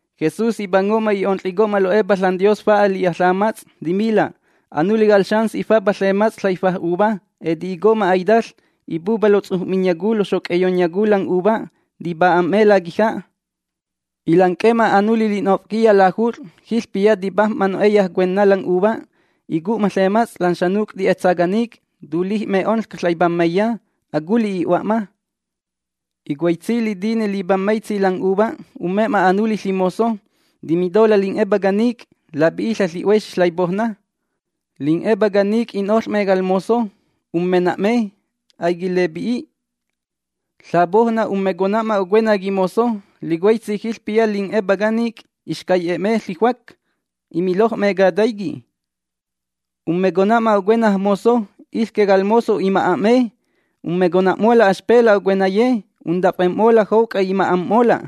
Jesús ipango'ma i'onƚico'ma lo'epa ȽanDios fa'a li'a ƚamats'. Timila': ―Anuli cal xans ifapa ƚemats' ƚaifa' uva. Eti'ico'ma aitaƚ. Ipupa pe lotsuj'miyacu loxoc'eyonyacu lan 'uva, tipa'a'me laquija'. Ilanc'e'ma anuli li'nof'quiya lajut'ƚ, jiƚpiya tipajm'ma no'eya cuenna lan 'uva. Icu'ma ƚemats' lan xanuc' ti'etsa canic', tulij'me onƚca ƚaipammaiya. Aculi' i'hua'ma. Licuaitsi litine lipammaitsi lan 'uva umme'ma anuli ƚimozo. Timitola' lin'epá canic': “Lapi'iƚa' ƚi'huexi ƚaipoujna”. Lin'epá canic' i'noƚ'me cal mozo. Ummena'me. Aiquilepi'i. Ƚapoujna ummecona'ma ocuena quimozo. Licuaitsi jiƚpiya lin'epá canic' ixcai'e'me ƚijuac, imiloj'me cataiqui'. Ummecona'ma ocuenaj mozo. Iƚque cal mozo ima'a'me. Ummecona'mola' axpela' ocuenaye. Untafem'mola' jouc'a ima'am'mola'.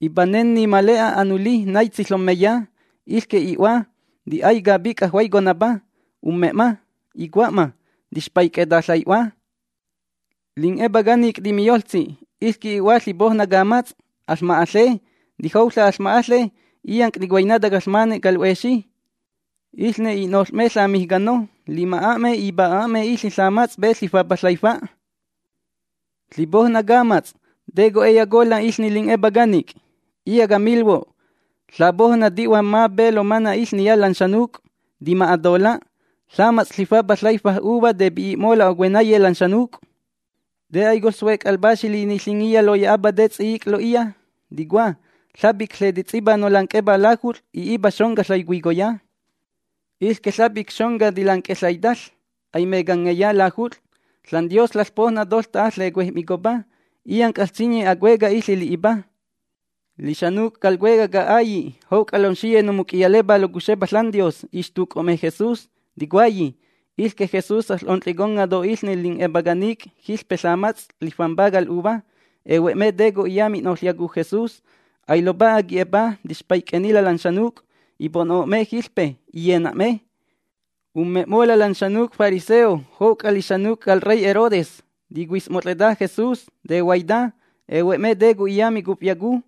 ’Ipanenni ma le'a anuli naitsi ƚommeya. Iƚque i'hua, ti'ay capic'a juaiconapa. Umme'ma. Icua'ma: “Tixpaic'eta ƚai'hua”. Lin'epá canic' timiyoƚtsi: “Iƚque i'hua ƚipoujna camats'. Aƚma'aƚe. Tijouƚa' aƚma'aƚe illanc' ticuainata caƚmane cal 'huexi.” Iƚne i'noƚ'me ƚamijcano, lima'a'me, ipa'a'me iƚe ƚamats' pe lifapa ƚaifa'. ’Ƚipoujna camats', ¿te co'e'eyacola' iƚne lin'epá canic'? Iya' camilhuo': Ƚapoujna ti'hua'ma pe lomana' iƚniya lan xanuc', tima'atola'. Ƚemats' lifapa ƚaifa' uva tepi'i'mola' ocuenaye lan xanuc'. ’¿Te a'i coƚsuec' al Paxi Liniƚingiya loya'apa te ts'i'ic' lo'iya? Ticua: Ƚapic ƚetets'ipa nolanc'epá lajut'ƚ, i'ipa xonca ƚaicuicoya. Iƚque ƚapic xonca tilanc'e ƚaitaƚ aimecangeya lajut'ƚ. ȽanDios ƚaƚPoujna toƚta'a ƚecuej'micopa. Illanc' aƚsinyi acueca' iƚe li'ipa. Lixanuc' cal cuecaj ca'ailli' jouc'a lomxiye nomuc'iyalepá locuxepa ȽanDios ixtuc'o'me Jesús, ticuayi: “Iƚque Jesús aƚ'onƚiconga' to iƚne lixcay lin'epá canic' jiƚpe ƚamats' lifampa cal 'uva”. Ehue'me te co'iya mi'noƚyacu Jesús. Ailopa'a qui'e'epa. Tixpaic'ennila' lan xanuc'. Ipo'no'me jiƚpe. Iyena'me. Ummem'mola' lan xanuc' fariseo jouc'a lixanuc' cal rey Herodes. Ticuis'mot'ƚeta Jesús. Tehuaita. Ehue'me te co'iya micufyacu.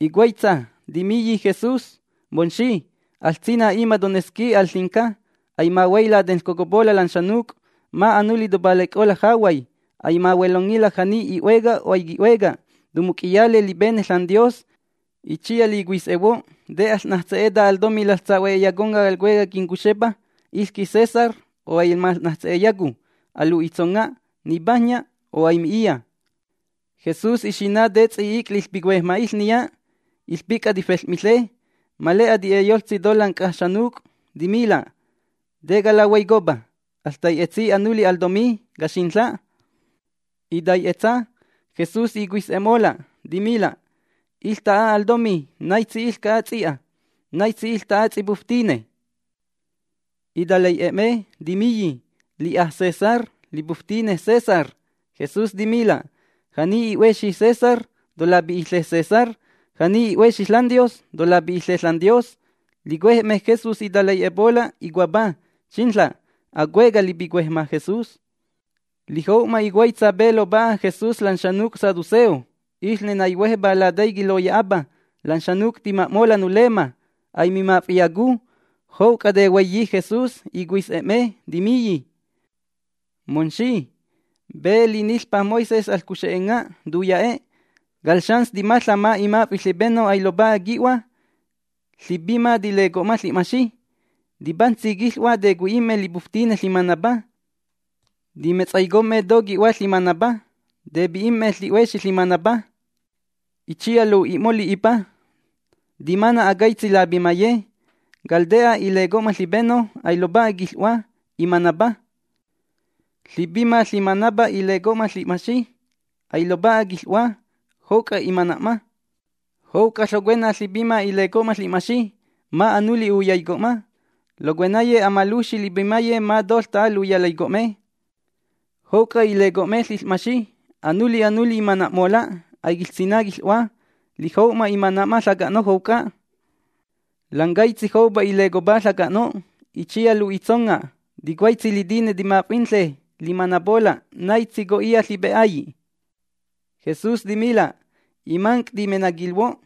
Icuaitsa, timiyi Jesús: ―Momxi, aƚsina' ima' tonesqui al ƚinca. Aimahuay latenƚcocopola' lan xanuc'. Ma' anuli topalaic'ola' jahuay. Aimahuelongila' ja'ni i'hueca o aiqui'hueca. Tomuc'iyale lipene ȽanDios. Itsiya licuis'ehuo', ¿te aƚ'najtse'eta al tomí laƚsahue'eyaconga' cal cuecaj quincuxepa, iƚque César? O ¿aimaƚ'najtse'eyacu? Alu'itsonga', ¿nipajnya o aimi'iya? Jesús ixina' te ts'i'ic' liƚpicuejma' iƚniya. Iƚpic'a tifel'miƚe. Ma le'a ti'e'eyoƚtsi to lan c'a xanuc'. Timila': ―¿Te calahuaicopa? Aƚtai'etsi anuli al tomí, caxinƚa'. Itai'etsa. Jesús icuis'e'mola', timila': ―Iƚta'a al tomí, ¿naitsi iƚca'a ts'i'a? ¿Naitsi iƚta'a ts'ipuftine? Italai'e'e'me, timiyi: ―Li'a César, lipuftine César. Jesús timila': ―Ja'ni i'huexi César, tolapi'iƚe César. Ja'ni i'huexi ȽanDios, tolapi'iƚe ȽanDios. Licuej'me Jesús litalai'epola' icuapá: ―¡Xinƚa'! Acueca' lipicuejma' Jesús. Lijou'ma icuaitsa pe lopa'a Jesús lan xanuc' saduceo. Iƚne naihuejpá lataiqui' loya'apa: “Lan xanuc' tima'mola' nulemma, aimimaf'iyacu”. Jouc'a tehuaiyi Jesús, icuis'e'me, timiyi: ―Momxi, pe liniƚpa Moisés aƚcuxenga', tuya'e': “Cal xans timaƚa', ma' imaf'i' ƚipeno ailopa'a qui'hua, ƚipima tileco'ma ƚi'maxi. Tipajntsi quiƚ'hua tecui'i'me lipuftine ƚimanapa. Timetsaicom'me to qui'hua ƚimanapa. Tepi'im'me ƚi'huexi ƚimanapa.” Itsiya lu'i'mo' li'ipa. ’Timana' acaitsi lapimaye. Cal te'a ileco'ma ƚipeno. Ailopa'a quiƚ'hua. Imanapa. Ƚipima ƚimanapa ileco'ma ƚi'maxi. Ailopa'a quiƚ'hua, jouc'a imana'ma. Jouc'a ƚocuena ƚipima ileco'ma ƚi'maxi. Ma' anuli uyaico'ma. Locuenaye amalujxi lipimaye ma toƚta'a luyalaico'me. Jouc'a ileco'me ƚiƚ'maxi, anuli anuli imana'mola'. Aiquiƚsina' quiƚ'hua. Lijou'ma imana'ma ƚaca'no' jouc'a. Lan caitsi joupa ilecopá ƚaca'no'. Itsiya lu'itsonga': Ticuaitsi litine timaf'inaƚe limanapola', ¿naitsi co'iya ƚipe'ailli'? Jesús timila': ―Imanc' timenaquilhuo'.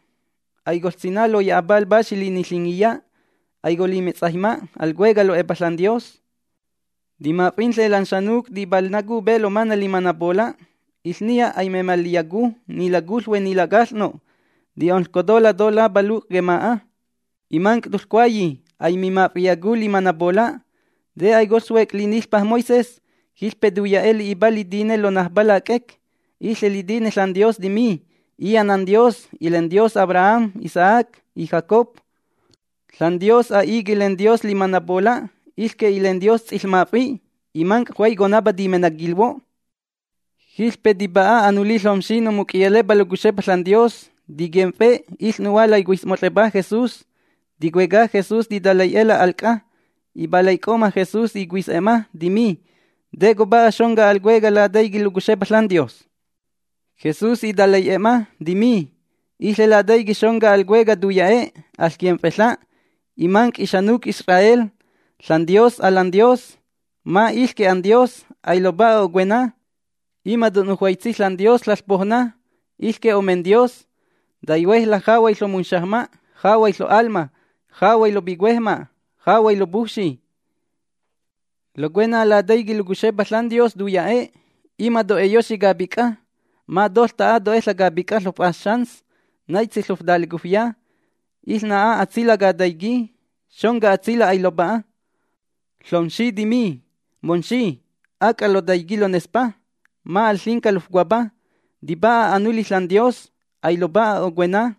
Aicoƚsina' loya'apa al Paxi Liniƚingiya, aicolimetsaijma al cuecaj lo'epa ȽanDios. Timaf'inƚe lan xanuc' tipalnacu pe lomana' limanapola', iƚniya aimemalƚiyacu, ni lacuƚhue ni lacaƚ'no'. Ti'onƚcotola' to lapaluc' quema'a. ’Imanc' toƚcuayi: “Aimimaf'iyacu limanapola'”. ¿Te aicoƚsuec' liniƚpa Moisés? Jiƚpe tuya'e' li'ipa litine lonajpa lac'ec. Iƚe litine ȽanDios timi: “Iya' NanDios, ilenDios Abraham, Isaac y Jacob”. ȽanDios a'i quilenDios limanapola'. Iƚque ilenDios ts'iƚmaf'i'. Imanc' juaiconapa timenaquilhuo'. Jiƚpe tipa'a anuli ƚomxi nomuc'iyalepa locuxepa ȽanDios. Tiquimf'e iƚnu'hua laicuis'mot'ƚepa Jesús, ticueca Jesús titalai'e'ela' al c'a. Ipalaic'o'ma Jesús icuis'e'ma, timi: ―¿Te copa'a xonca al cueca' lataiqui' locuxepa ȽanDios? Jesús italai'e'ma, timi: ―Iƚe lataiqui' xonca al cueca' tuya'e': “Aƚquimf'eƚa', imanc' ixanuc' Israel. ȽanDios, ƚalanDios, ma' iƚque anDios. Ailopa'a cocuena. Ima' to'nujuaitsi ȽanDios ƚoPoujna. Iƚque omenDios. Taihuejla' jahuay ƚomunxajma', jahuay ƚo'alma, jahuay lopicuejma', jahuay lopujfxi.” Locuena lataiqui' locuxepa ȽanDios tuya'e': “Ima' to'eyoxi capic'a. Ma toƚta'a to'eƚa' capic'a ƚof'as xans, naitsi ƚoftalecufya.” Iƚna'a atsila' cataiquí. Xonca atsila' ailopa'a. Ƚomxi timi: ―Momxi, ac'a lotaiqui' lonespa. Ma' al ƚinca lofcuapa. Tipa'a anuli ȽanDios, ailopa'a cocuena.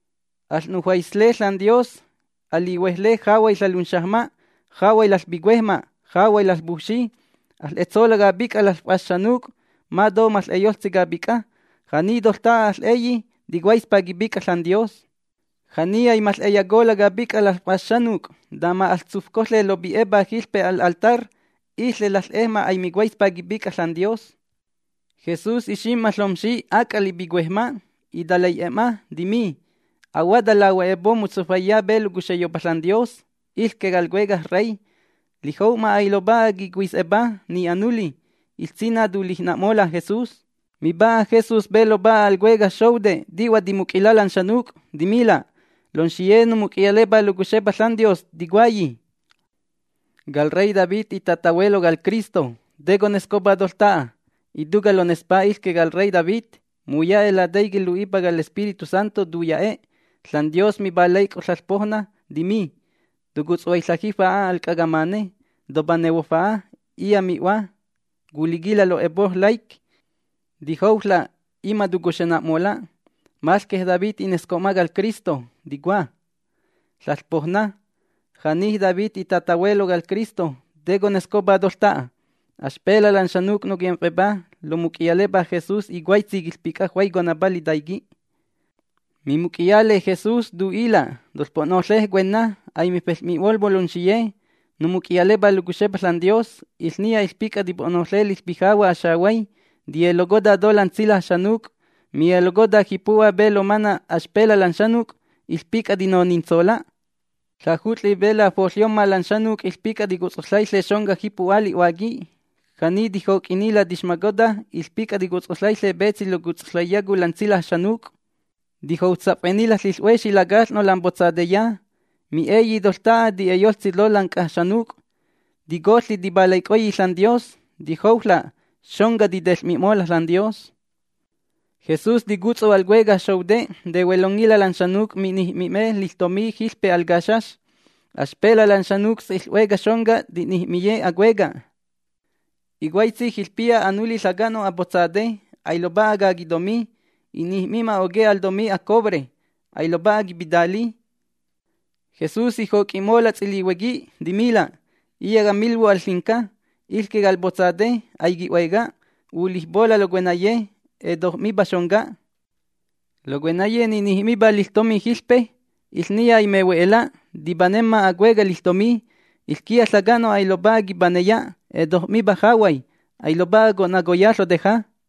Aƚ'nujuaisle ȽanDios, alihuejle jahuay ƚalunxajma', jahuay laƚpicuejma', jahuay laƚpujfxi. Aƚ'etsola' capic'a laƚf'as xanuc' ma to maƚ'eyoƚtsi capic'a. Ja'ni toƚta'a aƚ'eyi, ticuaispa quipic'a ȽanDios. Ja'ni aimaƚ'eyacola' capic'a laƚf'as xanuc', tama aƚtsufcoƚe lopi'epa jiƚpe al altar, iƚe laƚ'ejma' aimicuaispa quipic'a ȽanDios. Jesús ixim'ma ƚomxi ac'a lipicuejma'. Italai'e'e'ma, timi: ―Ahuata lahue'epo' motsufaiya pe locuxeyopa ȽanDios, iƚque cal Cuecaj Rey. Lijou'ma ailopa'a quicuis'epa, ni anuli. Iƚsina' tulijna'mola' Jesús. Mipa'a Jesús pe lopa'a al cuecaj xoute' ti'hua timuc'ila' lan xanuc'. Timila': ―Lomxiye nomuc'iyalepá locuxepa ȽanDios ticuayi: “Cal rey David itatahuelo cal Cristo”. ¿Te conescopa toƚta'a? Ituca' lonespa iƚque cal rey David. Muya'e' lataiqui' lu'ipa cal Espíritu Santo tuya'e': ȽanDios ipalaic'o'ma ƚaiPoujna, timi: “Tocutsaiƚa' jifa'a al c'a camane. Topanehuo fa'a, iya' mi'hua culiquila' lo'epo' laic'. Tijouƚa', ima' tocuxena'mola'.” Maƚque David inesco'ma cal Cristo, ticua “… ƚaiPoujna”. Ja'ni David itatahuelo cal Cristo, ¿te conescopa toƚta'a? Axpela' lan xanuc' noquimf'epá lomuc'iyalepa Jesús icuaitsi quiƚpic'a juaiconapa litaiqui'. Mimuc'iyale Jesús tu'ila': ―Toƚpo'noƚe cuenna, aimifel'mi'molhuo' lomxiye nomuc'iyalepá locuxepa ȽanDios. Iƚniya iƚpic'a tipo'noƚe liƚpijahua' axehuay, tiyelocota to lan tsilaj xanuc'. Miyelocota jipu'hua pe lomana' axpela' lan xanuc', iƚpic'a tinonintsola'. Ƚajut'ƚi pe lafoƚyomma lan xanuc' iƚpic'a ticutsoƚaiƚe xonca jipu'hua li'huáqui. Ja'ni tijoc'innila' tixmocota iƚpic'a ticutsoƚaiƚe petsi locutsoƚaiyacu lan tsilaj xanuc'. Tijoutsaf'ennila' ƚiƚ'huexi lacaƚ'no' lam potsateya. Mi'eyi toƚta'a ti'e'eyoƚtsi to lan c'a xanuc'. Ticoƚi tipalaic'oyi ȽanDios. Tijouƚa', xonca titeƚ'mi'mola' ȽanDios. Jesús ticutsu al cuecaj xoute' tehuelongila' lan xanuc' mi'nij'mi'me liƚtomí jiƚpe al caxax. Axpela' lan xanuc' ts'iƚ'hueca xonca ti'nij'miyi acueca'. Icuaitsi jiƚpiya anuli ƚaca'no' apotsate. Ailopa'a caquitomí. I'nij'mi'ma oque' al tomí acobre. Ailopa'a quipitali. Jesús ijoc'i'mola' ts'ilihuequi, timila': ―Iya' camilhuo' al ƚinca: Iƚque cal potsate, aiqui'hueca, ulijpola' locuenaye. Etoj'mipa xonca. Locuenaye ni'nij'mipá liƚtomí jiƚpe, iƚniya aimehue'ela'. Tipanemma acueca' liƚtomí. Iƚquiya ƚaca'no' ailopa'a quipaneya, etoj'mipa jahuay, ailopa'a co'nacoya ƚoteja.